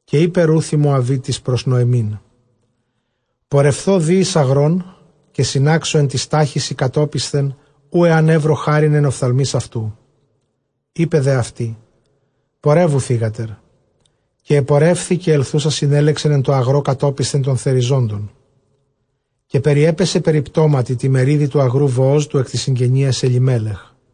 Καὶ εἶπε Ῥοὺθ ἡ Μωαβίτις πρὸς Νωεμὶν, πορεῦθω δὴ εἰς ἀγρὸν, καὶ συνάξω ἐν τοῖς στάχυσι κατόπισθεν οὗ ἐὰν εὕρω χάριν ἐν ὀφθαλμοῖς αὐτοῦ. εἶπε δὲ αὐτῇ, πορεύου, θύγατερ. Καὶ ἐπορεύθη· καὶ ἐλθοῦσα συνέλεξεν ἐν τῷ ἀγρῷ κατόπισθε τῶν θεριζόντων· καὶ περιέπεσε περιπτώματι τῇ μερίδι τοῦ ἀγροῦ Βοὸζ, τοῦ ἐκ τῆς συγγενείας Ἐλιμέλεχ.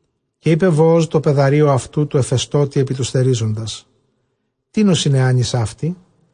Καὶ εἶπε Βοὸζ τῷ παιδαρίῳ αὐτοῦ τῷ ἐφεστῶτι ἐπὶ τοὺς θερίζοντας, τίνος ἡ νεᾶνις αὕτη;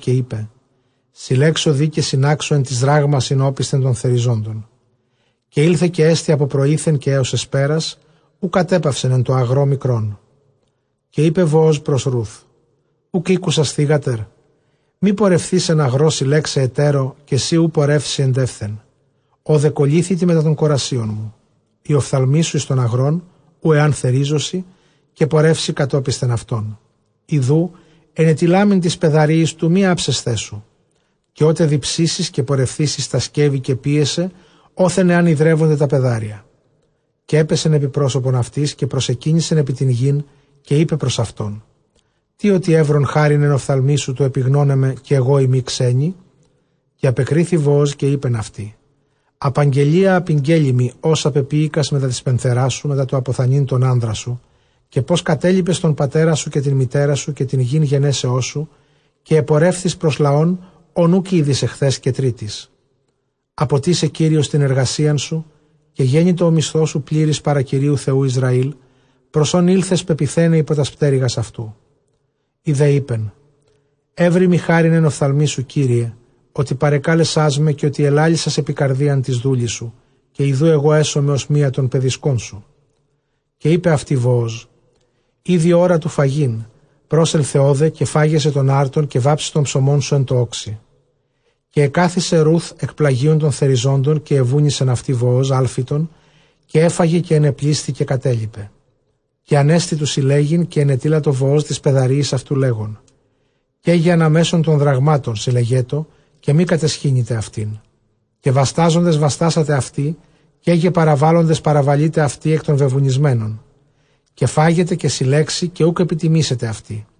Καὶ εἶπε, συλλέξω δὴ καὶ συνάξω ἐν τοῖς δράγμασιν ὄπισθεν τῶν θεριζόντων· καὶ ἦλθε καὶ ἔστη ἀπὸ πρωΐθεν καὶ ἕως ἑσπέρας, οὐ κατέπαυσεν ἐν τῷ ἀγρῷ μικρόν. Καὶ εἶπε Βοὸζ πρὸς Ῥοὺθ, οὐκ ἤκουσας θύγατερ; μὴ πορευθῇς ἐν ἀγρῷ συλλέξαι ἑτέρῳ· καὶ σὺ οὐ πορεύσῃ ἐντεῦθεν, ὧδε κολλήθητι μετὰ τῶν κορασίων μου. Οἱ ὀφθαλμοί σου εἰς τὸν ἀγρὸν οὗ ἐὰν θερίζωσι, καὶ πορεύσῃ κατόπισθεν αὐτῶν· ἰδοὺ ἐνετειλάμην τοῖς παιδαρίοις τοῦ μὴ ἅψασθαί σου· καὶ ὅτε διψήσεις καὶ πορευθήσῃ εἰς τὰ σκεύη, καὶ πίεσαι ὅθεν ἐὰν ὑδρεύωνται τὰ παιδάρια. Καὶ ἔπεσεν ἐπὶ πρόσωπον αὐτῆς, καὶ προσεκύνησεν ἐπὶ τὴν γῆν, καὶ εἶπε πρὸς αὐτὸν, τί ὅτι εὗρον χάριν ἐν ὀφθαλμοῖς σου τοῦ ἐπιγνῶναί με, καὶ ἐγώ εἰμι ξένη; Καὶ ἀπεκρίθη Βοὸζ, καὶ εἶπεν αὐτῇ, ἀπαγγελίᾳ ἀπηγγέλη μοι ὅσα πεποίηκας μετὰ τῆς πενθερᾶς σου μετὰ τὸ ἀποθανεῖν τὸν ἄνδρα σου· καὶ πῶς κατέλιπες τὸν πατέρα σου καὶ τὴν μητέρα σου, καὶ τὴν γῆν γενέσεώς σου, καὶ ἐπορεύθης πρὸς λαὸν ὃν οὐκ ᾔδεις ἐχθὲς καὶ τρίτης. Ἀποτίσαι Κύριος τὴν ἐργασίαν σου· γένοιτο ὁ μισθός σου πλήρης παρὰ Κυρίου Θεοῦ Ἰσραὴλ, πρὸς ὃν ἦλθες πεποιθέναι ὑπὸ τὰς πτέρυγας αὐτοῦ. Ἡ δὲ εἶπεν, εὕροιμι χάριν ἐν ὀφθαλμοῖς σου κύριε, ὅτι παρεκάλεσάς με, καὶ ὅτι ἐλάλησας ἐπὶ καρδίαν τῆς δούλης σου, καὶ ἰδοὺ ἐγὼ ἔσομαι ὡς μία τῶν παιδισκῶν σου. Καὶ εἶπεν αὐτῇ Βοὸζ, ἤδη ὥρα τοῦ φαγεῖν, πρόσελθε ὧδε καὶ φάγεσαι τῶν ἄρτων, καὶ βάψεις τὸν ψωμόν σου ἐν τῷ ὄξει· καὶ ἐκάθισε Ῥοὺθ ἐκ πλαγίων τῶν θεριζόντων· καὶ ἐβούνισεν αὐτῇ Βοὸζ ἄλφιτον, καὶ ἔφαγε καὶ ἐνεπλήσθη καὶ κατέλιπε, Καὶ ἀνέστη τοῦ συλλέγειν· καὶ ἐνετείλατο Βοὸζ τοῖς παιδαρίοις αὐτοῦ, λέγων, καί γε ἀναμέσον τῶν δραγμάτων συλλεγέτω, καὶ μὴ καταισχύνητε αὐτήν· Καὶ βαστάζοντες βαστάσατε αὐτῇ, καί γε παραβάλλοντες παραβαλεῖτε αὐτῇ ἐκ τῶν βεβουνισμένων, καὶ φάγεται, καὶ συλλέξει, καὶ οὐκ ἐπιτιμήσετε αὐτῇ.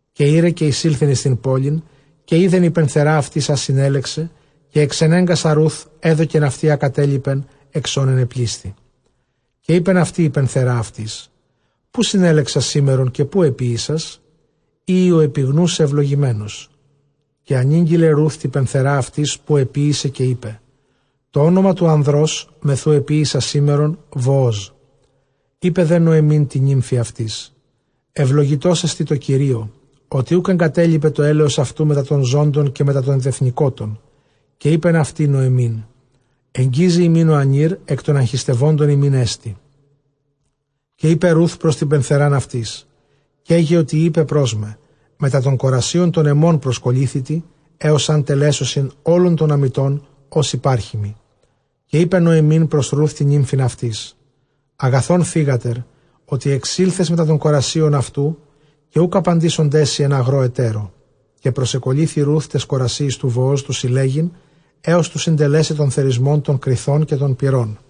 Καὶ ᾖρε καὶ εἰσῆλθεν εἰς τὴν πόλιν· καὶ εἶδεν ἡ πενθερὰ αὐτῆς ἃ συνέλεξε· καὶ ἐξενέγκασα Ῥοὺθ ἔδωκεν αὐτῇ ἃ κατέλιπεν ἐξ ὧν ἐνεπλήσθη. Καὶ εἶπεν αὐτῇ ἡ πενθερὰ αὐτῆς, ποῦ συνέλεξας σήμερον καὶ ποῦ ἐποίησας; εἴη ὁ ἐπιγνούς σε εὐλογημένος· καὶ ἀνήγγειλε Ῥοὺθ τῇ πενθερᾷ αὐτῆς ποῦ ἐποίησε, καὶ εἶπε, τὸ ὄνομα τοῦ ἀνδρὸς μεθʼ οὗ ἐποίησα σήμερον Βοόζ. Εἶπε δὲ Νωεμὶν τῇ νύμφῃ αὐτῆς, εὐλογητός ἐστι τῷ Κυρίῳ, ὅτι οὐκ ἐγκατέλιπε τὸ ἔλεος αὐτοῦ μετὰ τῶν ζώντων καὶ μετὰ τῶν τεθνηκότων· καὶ εἶπεν αὐτῇ Νωεμὶν, ἐγγίζει ἡμῖν ὁ ἀνὴρ, ἐκ τῶν ἀγχιστευόντων ἡμῖν ἐστι. Καὶ εἶπε Ῥοὺθ πρὸς τὴν πενθερὰν αὐτῆς, καί γε ὅτι εἶπε πρὸς μέ, μετὰ τῶν κορασίων τῶν ἐμῶν προσκολλήθητι, ἕως ἂν τελέσωσιν ὅλον τὸν ἀμητὸν ὃς ὑπάρχει μοι. Καὶ εἶπε Νωεμὶν πρὸς Ῥοὺθ τὴν νύμφην αὐτῆς, ἀγαθὸν θύγατερ, ὅτι ἐξῆλθες μετὰ τῶν κορασίων αὐτου, καὶ οὐκ ἀπαντήσονταί σοι ἐν ἀγρῷ ἑτέρῳ. Καὶ προσεκολλήθη Ῥοὺθ τοῖς κορασίοις τοῦ Βοὸζ τοῦ συλλέγειν, ἕως τοῦ συντελέσαι τὸν θερισμὸν τῶν κριθῶν καὶ τῶν πυρῶν.